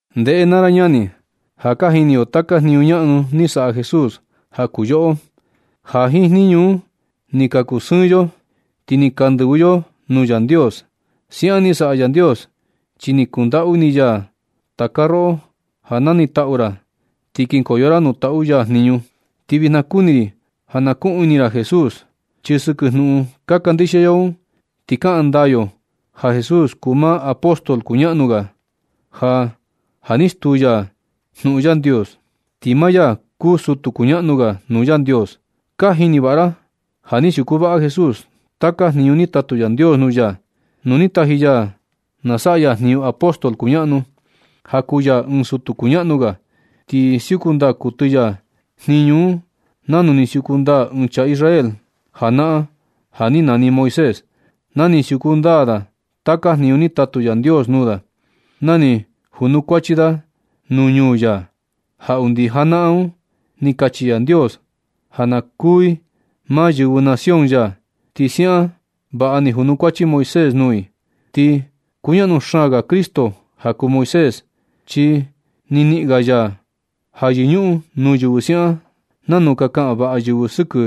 Ndeꞌe naa ra ñani, ja ka jini yo taka jniñu ñaꞌnu ni saꞌa Jesús ja kuu yoꞌo, ja jiin jniñu un ni ka kusɨɨn yo, ti ni ka ndɨvɨ yo nuu Yandios. Siaꞌan ni saꞌa Yandios chi ni kundaꞌu ini ya taka roꞌo ja na nitaꞌu ra ti kinkoyo ra nuu taꞌu ya jniñu. Ti vijna kuni ri ja na kuꞌun ini ra Jesús, chi sɨkɨ jnuꞌun ka kandixia yo un ti kaꞌan ndaa yo ja Jesús kuu maa apóstol kuñaꞌnu ga ja ja ni stuu ya jnuꞌun Yandios, ti maa ya kuu sutu kuñaꞌnu ga nuu Yandios. Ka jini vaꞌa ra ja ni siuku vaꞌa Jesús taka jniñu ni tatu Yandios nuu ya, nu ni taji ya na saꞌa ya jniñu apóstol kuñaꞌnu, ja kuu ya ɨɨn sutu kuñaꞌnu ga. Ni siuku ndaa kuɨtɨ ya jniñu un nanu ni siuku ndaa ɨɨn chaa Israel janaꞌan ja ni nani Moisés, na ni siuku ndaa da taka jniñu ni tatu Yandios nuu da, na ni janukuachi da nuu ñuu ya, ja undi janaꞌan un ni kachi Yandios ja ka kuu i maa yɨvɨ nación ya, ti siaꞌan vaꞌa ni junukuachi Moisés nuu i. Ti kuñaꞌnu xaan ga Cristo ja kuu Moisés, chi ni niꞌin ga ya ja yɨñuꞌun nuu yɨvɨ siaꞌan nanu ka kaꞌan vaꞌa yɨvɨ sɨkɨ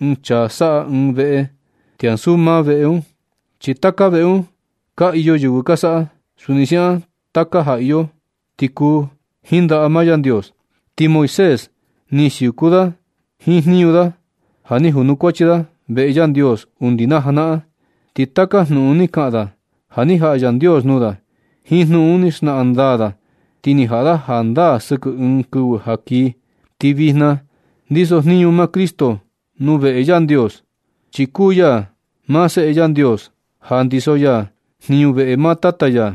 ɨɨn chaa saꞌa ɨɨn veꞌe ti ansu maa veꞌe un. Chi taka veꞌe un ka iyo yɨvɨ ni ka saꞌa. Suni siaꞌan taka ja iyo ni kuu jiin ndaꞌa maa Yandios. Ti Moisés ni siuku vaꞌa da jiin jniñu da ja ni junukuachi da veꞌe Yandios undi naa janaꞌan. Ti taka jnuꞌun ni kaꞌan da, ja ni jaꞌa Yandios nuu da. Jiin jnuꞌun un ni xnaꞌan ndaa da ti ni jaꞌa da jandaa sɨkɨ ɨɨn kɨvɨ ja kii. Ti vijna ndiso jniñu maa Cristo nuu veꞌe Yandios, chi kuu ya maa Seꞌe Yandios ja ndiso ya jniñu veꞌe maa Tata ya.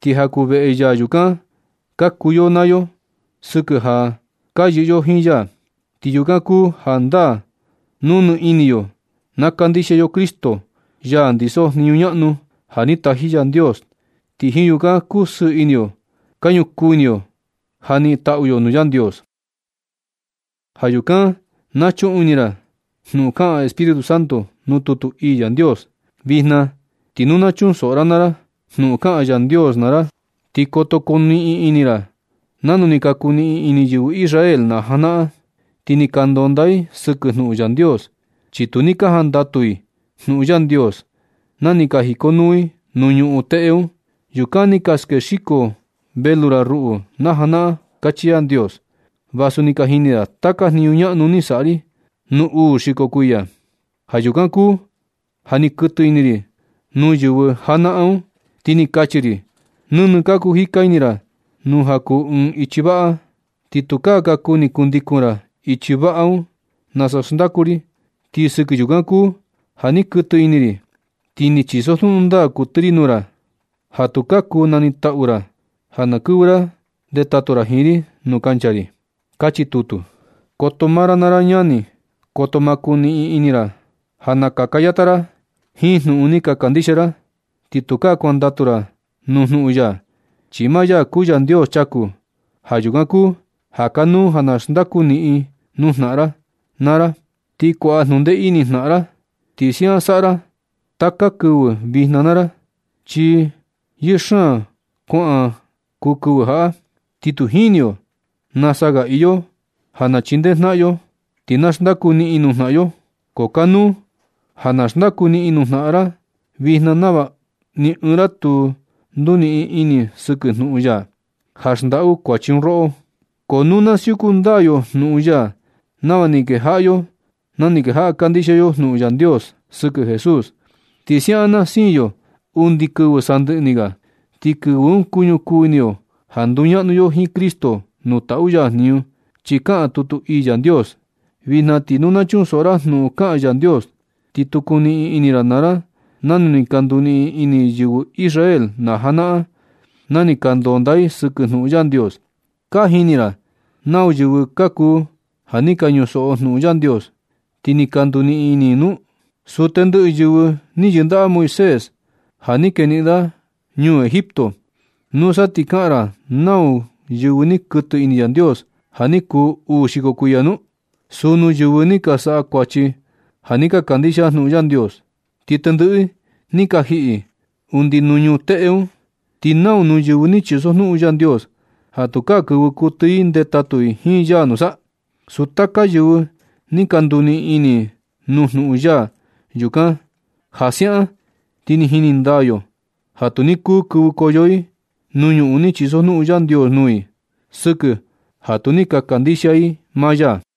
Ti ja kuu veꞌe ya yukan ka kuu yoꞌo naa yo sɨkɨ ja ka yɨꞌɨ yo jiin ya. Ti yukan kuu jandaa nu nɨ ini yo na kandixia yo Cristo, ya ndiso jniñu ñaꞌnu ja ni taji Yandios. Ti jiin yukan kusɨɨ ini yo ka ñukuu ini yo ja niꞌin taꞌu yo nuu Yandios. Ja yukan na chuꞌun ini ra jnuꞌun kaꞌan Espíritu Santo nuu tutu ii Yandios: Vijna ti nu na chunsoꞌo ra naa ra jnuꞌun kaꞌan Yandios naa ra. Ti koto kuniꞌin ini ra nanu ni ka kuniꞌin ini yɨvɨ Israel na janaꞌan. Ti ni ka ndonda i sɨkɨ jnuꞌun Yandios, chi tu ni ka jandatu i nuu Yandios na ni ka jikonuu i nuu ñuꞌun teꞌe un. Yukan ni ka skexiko velu ra ruꞌu na janaꞌan, kachi Yandios, vasu ni ka jini da taka jniñu ñaꞌnu ni saꞌa ri nu uu xiko kuiya. Ja yukan kuu ja ni kuɨtɨ ini ri nuu yɨvɨ janaꞌan un. Ti ni kachi ri: Nɨnɨ ka kuu jika ini ra nuu ja kuu ɨɨn ichi vaꞌa. Ti tukaa ka kuni kundikun ra ichi vaꞌa un nasa xndaku ri. Ti sɨkɨ yukan kuu ja ni kuɨtɨ ini ri, ti ni chisojnuꞌun ndaa kuɨtɨ ri nuu i, ja tukaa kuu nanitaꞌu i ja na kɨvɨ i ndetatu i jiin ri nuu kancha ri. Kachi tutu. Koto maa ra naa ra ñani. Koto ma kuniꞌin ini ra ja nakaka yata ra jiin jnuꞌun ni ka kandixia ra ti tukaa kuandatu ra nuu jnuꞌun ya, chi maa ya kuu Yandios chaku. Ja yukan kuu ja kanuu ja na xndaku niꞌin nuu jnaꞌan ra naa ra ti kuaꞌa jnundee ini jnaꞌan ra. Ti siaꞌan saꞌa ra taka kɨvɨ vijna naa ra, chi yɨɨ xaan kuan kuu kɨvɨ jaꞌa, ti tu jini yo nasa ga iyo ja na chindee jnaꞌan yo, ti na xndaku niꞌin nuu jnaꞌan yo. Ko kanuu ja na xndaku niꞌin nuu jnaꞌan ra vijna nava ni ɨɨn ra tu nduniꞌin ini sɨkɨ jnuꞌun ya, ja xndaꞌu kuachi un roꞌo. Ko nu na siuku ndaa yo jnuꞌun ya nava ni kejaꞌa yo, na ni kejaꞌa kandixia yo jnuꞌun Yandios sɨkɨ Jesús, ti siaꞌan na siin yo undi kɨvɨ sandɨꞌɨ ni ga. Ti kɨvɨ un kuñukuu ini yo ja nduñaꞌnu yo jiin Cristo nuu taꞌu ya jniñu. Chi kaꞌan tutu ii Yandios: Vijna ti nu na chunsoꞌo ra jnuꞌun kaꞌan Yandios, ti tu kuniꞌin ini ra naa ra nanu ni ka nduniꞌin ini yɨvɨ Israel najanaꞌan, na ni ka ndonda i sɨkɨ jnuꞌun Yandios. ¿Ka jini ra nau yɨvɨ ka kuu ja ni ka ñusoꞌo jnuꞌun Yandios ti ni ka nduniꞌin ini un nu? Suu tendɨꞌɨ yɨvɨ ni yɨndaꞌa Moisés ja ni keniꞌin da ñuu Egipto. ¿Nusa ti ka naꞌan ra nau nuu yɨvɨ ni kuɨtɨ ini Yandios ja ni kuu uu xiko kuiya nu? Suu nuu yɨvɨ ni ka saꞌa kuachi ja tu ni ka kandixia jnuꞌun Yandios, ti tendɨꞌɨ i ni ka jiꞌi undi nuu ñuꞌun teꞌe un. ¿Ti nau nuu yɨvɨ ni chisojnuꞌun Yandios ja tukaa kɨvɨ kuɨtɨ i ndetatu ri jiin ya nusa? Suu taka yɨvɨ ni ka nduniꞌin ini nuu jnuꞌun ya yukan. Ja siaꞌan ti ni jini ndaa yo ja tu ni kuu kɨvɨkoyo i nuu ñuꞌun ni chisojnuꞌun Yandios nuu i, sɨkɨ ja tu ni ka kandixia i maa ya.